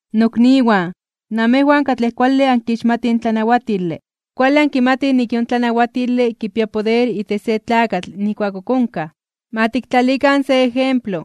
Nokniwan, namejwan katlej kuale ankixmatij in tlanawatile, kuale ankimatij nik in yon tlanawatile kipia poder itech se tlakatl nijkuak ok onkaj. Ma tiktlalikan se ejemplo,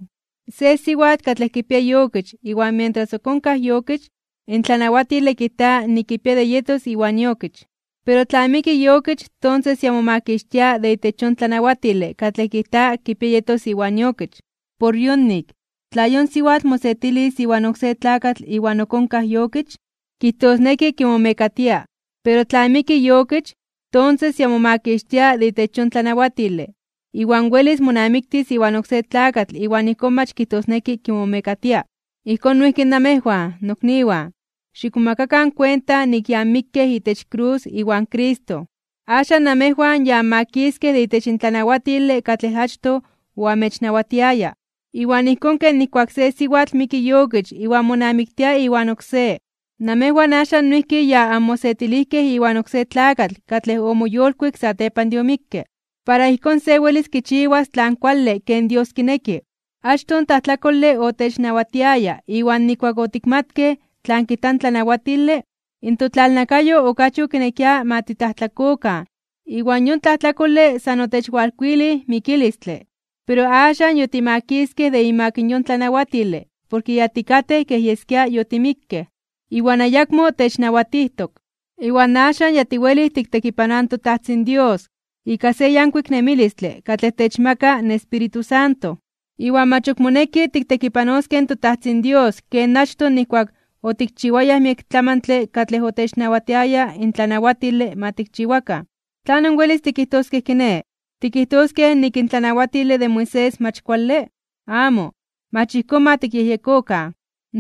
se siwatl katlej kipia iokich iwan mientras ok onkaj iokich, in tlanawatile kijta nik kipia de yetos iwan iokich. Pero tla miki iokich, tonses ya momakixtia de itech yon tlanawatile katlej kijta kipia yetos iwan iokich. Por yonik, tla yon siwatl mosetilis iwan oksé tlakatl iwan ok onkaj iokich, kijtosneki kimomekatia. Pero tla miki iokich, tonses ya momakixtia de itech yon tlanawatile, iwan welis monamiktis iwan oksé tlakatl iwan ijkón mach kijtosneki kimomekatia. Ijkón noijki namejwan, nokniwan, xikmomakakan kuenta nik ya anmikkej itech krus iwan Cristo. Axan namejwan ya anmakiskej de itech in tlanawatile katlej achtoj oamechnawatiaya. Iwan ijkón ken nijkuak se siwatl miki iokich iwan monamiktia iwan oksé, namejwan axan noijki ya anmosetilijkej iwan oksé tlakatl katlej omoyolkuik satepan de omikke. Para ijkón se welis kichiwas tlan kuale ken Dios kineki. Achtoj in tlajtlakole otechnawatiaya iwan nijkuak otikmatkej tlan kijta in tlanawatile, in totlalnakayo okachi okinekia ma titlajtlakokan iwan yon tlajtlakole san otechwalkuilij mikilistle. Pero axan yotimakiskej de imak yon tlanawatile porke ya tikatej kej yeskia yotimikkej, iwan ayakmo technawatijtok. Iwan axan ya tiwelij tiktekipanoaj in toTajtzin Dios ika se yankuik nemilistle katlej techmaka in Espíritu Santo, iwan mach ok moneki tiktekipanoskej in toTajtzin Dios ken achtoj nijkuak otikchiwayaj miek tlamantle katlej otechnawatiaya in tlanawatile ma tikchiwakan. ¿Tlanon welis tikijtoskej kiné? ¿Tikijtoskej nik in tlanawatile de Moisés mach kuale? ¡Amo, mach ijkón ma tikyejyekokan!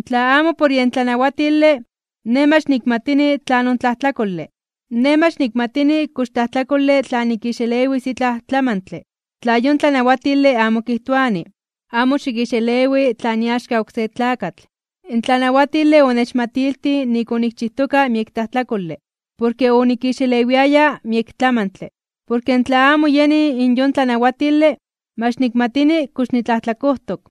Tla amo por yen tlanawatile, nej mach nikmatini tlanon tlajtlakole. Nej mach nikmatini kox tlajtlakole tla nikixelewis itlaj tlamantle, tla yon tlanawatile amo kijtoani: “Amo xikixelewi tlan iaxka oksé tlakatl.” In tlanawatile onechmatiltij nik onikchijtoka miek tlajtlakole, porke onikixelewiaya miek tlamantle. Porke tla amo yeni in yon tlanawatile, mach nikmatini kox nitlajtlakojtok.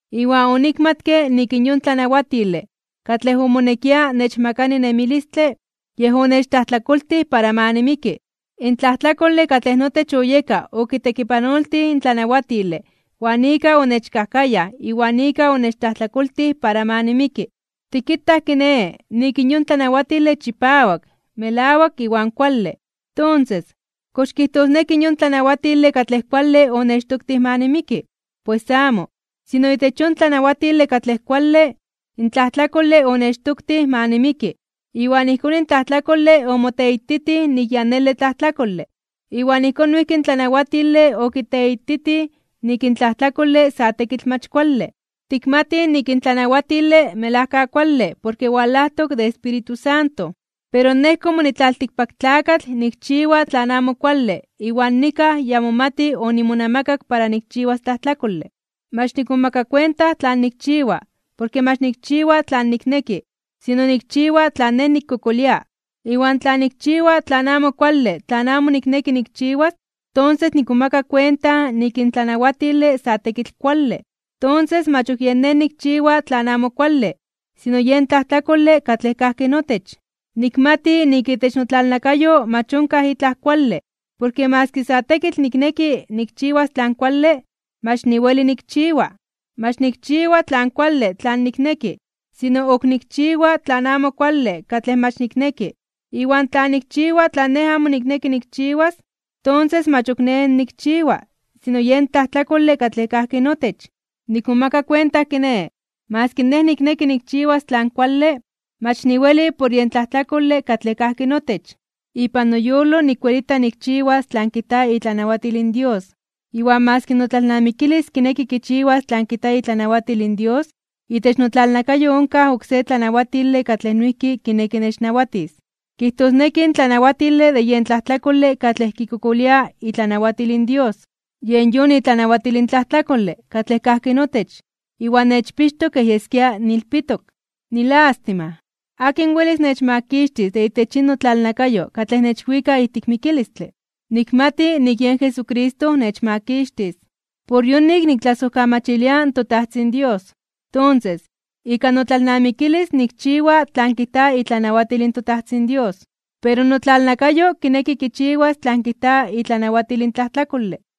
Iwan onikmatke nik in yon tlanawatile katlej omonekia nechmakani nemilistle, yej onechtlajtlakoltij para ma nimiki. In tlajtlakole katlej notech oyeka okitekipanoltij in tlanawatile iwan ika onechkajkayaj iwan ika onechtlajtlakoltij para ma nimiki. Tikitaj kiné, nik in yon tlanawatile chipawak, melawak, iwan kuale. Tonses, ¿kox kijtosneki in yon tlanawatile katlej kuale onechtoktij ma nimiki? ¡Pues amo! Sino itech yon tlanawatile katlej kuale, in tlajtlakole onechtoktij ma nimiki, iwan ijkón in tlajtlakole omoteititij nik ya nele tlajtlakole. Iwan ijkón noijki in tlanawatile okiteititij nik in tlajtlakole sa tekitl mach kuale. Tikmatij nik in tlanawatile melajka kuale porke walajtok de Espíritu Santo. Pero nej komo nitlaltikpaktlakatl nikchiwa tlan amo kuale iwan nikaj ya momati (kej yeskia) onimonamakak para nikchiwas tlajtlakole. Mach nikmomaka kuenta tlan nikchiwa, porke mach nikchiwa tlan nikneki, sino nikchiwa tlan nej nikkokolia. Iwan tla nikchiwa tlan amo kuale tlan amo nikneki nikchiwas, tonses nikmomaka kuenta nik in tlanawatile sa tekitl kuale. Tonses, mach ok yen nej nikchiwa tlan amo kuale, sino yen tlajtlakole katlej kajki notech. Nikmati nik itech notlalnakayo mach onkaj itlaj kuale, porke maski sa tekitl nikneki nikchiwas tlan kuale, mach niweli nikchiwa. Mach nikchiwa tlan kuale tlan nikneki, sino ok nikchiwa tlan amo kuale katlej mach nikneki. Iwan tla nikchiwa tlan nej amo nikneki nikchiwas, tonses mach ok nej nikchiwa, sino yen tlajtlakole katlej kajki notech. Nikmomaka kuenta kiné, maski nej nikneki nikchiwas tlan kuale, mach niweli por yen tlajtlakole katlej kajki notech. Ipan noyolo nikwelita nikchiwas tlan kijta itlanawatil in Dios. Iwan maski notlalnamikilis kineki kichiwas tlan kijta itlanawatil in Dios, itech notlalnakayo onkaj oksé tlanawatile katlej noijki kineki nechnawatis. Kijtosneki in tlanawatile de yen tlajtlakole katlej kikokolia itlanawatil in Dios. Yen yon itlanawatil in tlajtlakole katlej kajki notech iwan nechpixtok kej yeskia niilpitok. ¡Nilástima! ¿Akin welis nechmakixtis de itech yin notlalnakayo katlej nechwika ijtik mikilistle? Nikmati nik yen Jesucristo nechmakixtis. Por yonik niktlasojkamachilia in toTajtzin Dios. Tonses, ika notlalnamikilis nikchiwa tlan kijta itlanawatil in toTajtzin Dios, pero notlalnakayo kineki kichiwas tlan kijta itlanawatil in tlajtlakole.